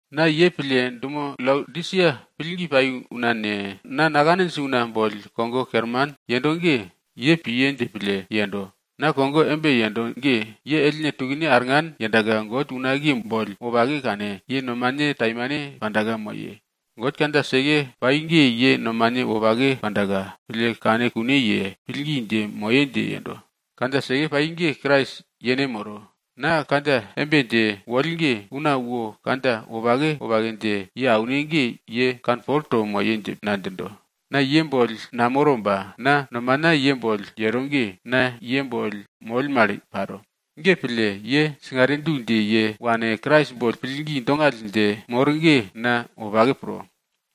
Na ye pille, dumo Laodisia pillgi pai una ne, na nakaninj una boll kogo kerman yendo ge, ye piye dje pille yendo. Na kogo embe yendo ge, ye ellne tukne arngan yendaka God unakiye boll wopake kane, ye nomane taimane panda moye. God kandja seke pai ge ye nomane wopake pandaka, pille kane kune ye, pillgi dje moye dje yendo. Kandja seke pai ge Krais yene moro. Na kandja embe dje woll ge, una wo kandja wopake wopake dje ye aune ge ye kanpol to moye dje na djindo. Na ye boll namoro ba na nomana ye boll yero ge, na ye boll moll mal paro. Ge pille, ye singare du dje ye wane, Krais boll pillgi dongall dje mor ge na wopake pro.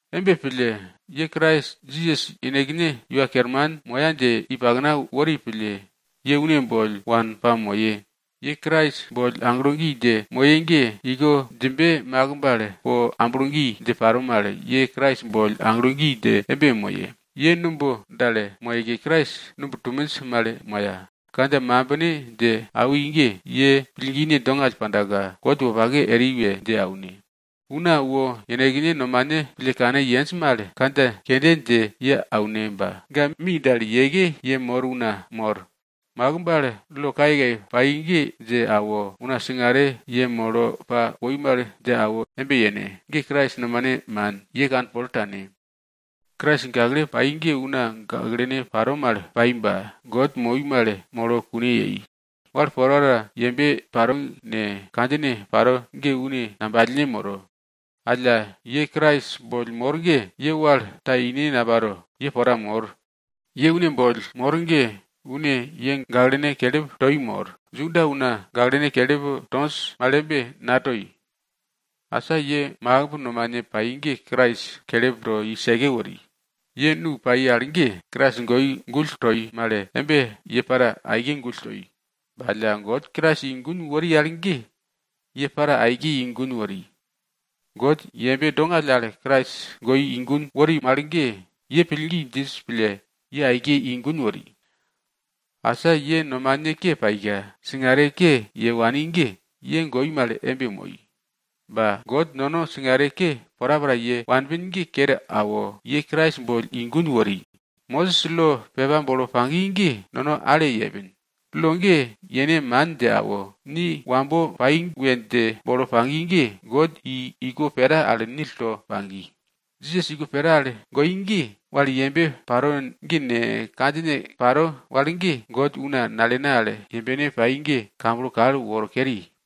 Embe pille, ye Krais Jisas yenekne Iwa Kerman moya dje i pakna wori pille, ye une boll wane pamoye. Ye Krais boll aglo gi dje moye ge, iko djimbe makimb al po amblo gi dje paro mal, ye Krais boll aglo gi dje embe moye. Ye numb dal moyeke Krais numb tuminj mal moya. Kandja mambine dje awi ge, ye pillgine dongall pandaka, God wopake eri we dje aune. Una wo yenekne nomane pille kane yenj mal kandja kende dje ye aune ba ga mi dal yeke yemor una mor. Makimb al lo kayekaye pai ge dje awo, una singare yemolo pa woi mal dje awo embe yene. Ge Krais nomane man, ye kanpol tane. Krais gakle pai ge una gaklene paro mal pai ba, God moi mal molo kune yei. Wal porapora yembe paro ne, kandjine paro ge une ngambalne moro. Alla ye Krais boll mor ge, ye wal ta ine naparo ye pora mor. Ye une boll mor ge, une ye gaklene kelip toi mor. Juda una gaklene kelip tonj mal embe natoi. Asa ye makimb nomane pai ge Krais kelip to i seke wori. Ye nu pai al ge, Krais goi gull toi mal embe ye para aike gull toi. Ba alla, God Krais i gun wori al ge ye para aike i gun wori. God yembe dongall al Krais goi i gun wori mal ge, ye pillgi djinj pille, ye aike i gun wori. Asa ye nomane ke paika, singare ke ye wani ge, ye goi mal embe moi. Ba God nono singare ke porapora ye wanpin ge kero awo, ye Krais boll i gun wori. Mosis lo pepa bolo pagi ge, nono ale yepin. Lo ge yene man dje awo, ni wambo pai we dje bolo pagi ge, God i iko pera al nil to pagi. Jisas iko pera al goi ge, wal yembe paro ge ne, kandjine paro wal ge, God una nalene al yembene pai ge, kamblo kal woro keri.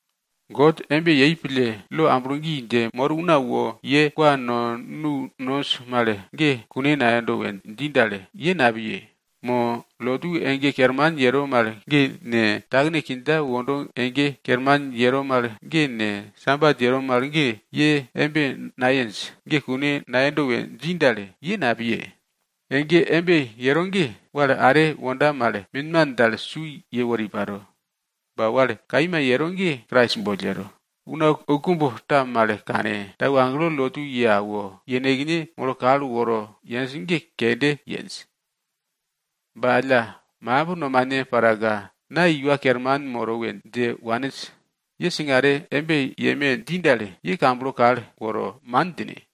God embe yei pille, lo amblo gi dje mor una wo ye kwa no nu nonj mal ge kune nayendo we dji dal, ye napiye. Mo lotu ege kerman yero mal ge ne, takene kindja wondo ege kerman yero mal ge ne, sabat yero mal ge, ye embe nayenj ge kune nayendo we dji dal, ye napiye. Ege embe yero ge wal are wonda mal minman dal su yewori paro. Ba wal kaima yero ge, Krais boll yero. Una oukumb ta mal kane, tau agelo lotu ye awo, yenekne molo kal woro yenj ge kende yenj. Ba ga makimb nomane paraka na iwa kerman moro we dje waninj. Ye singare embe yeme dji dal, ye kamblo kal woro, man djine.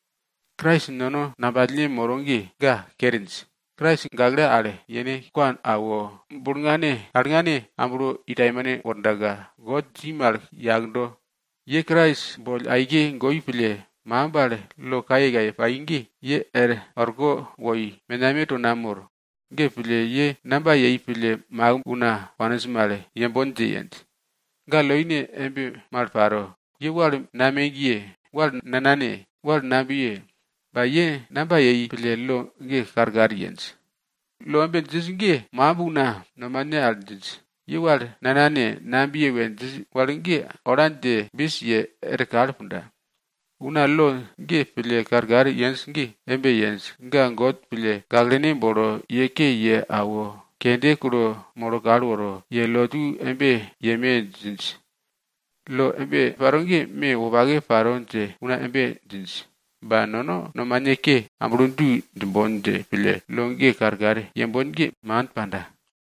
Krais nono ngambalne moro ge, ga kerinj. Krais gakle al yene kwa awo, bulngane, alngane, amblo i taimane wordaka, God dji mal yakdo. Ye Krais boll aike goi pille, makimb al lo kayekaye pai ge, ye er orko woi, menameto namor. Ge pille, ye namba yei pille makimb una waninj mal yembon dje yenj? Ga loine embe mal paro. Ye wal namegye, wal nanane, wal nabiye. Ba ye namba yei pille lo ge karkar yenj? Lo embe djinj ge, makimb una nomane al djinj. Ye wal nanane, nabiye we djinj wal ge ola dje bis ye er kal punda. Una lo ge pille karkar yenj ge embe yenj, ga God pille gaklene bolo ye ke ye awo, kende kulo molo kal woro, ye lotu embe yeme djinj. Lo embe paro ge me wopake paro dje una embe djinj. Ba nono nomane ke amblo du djimbon dje pille lo ge karkar yembon ge, man panda.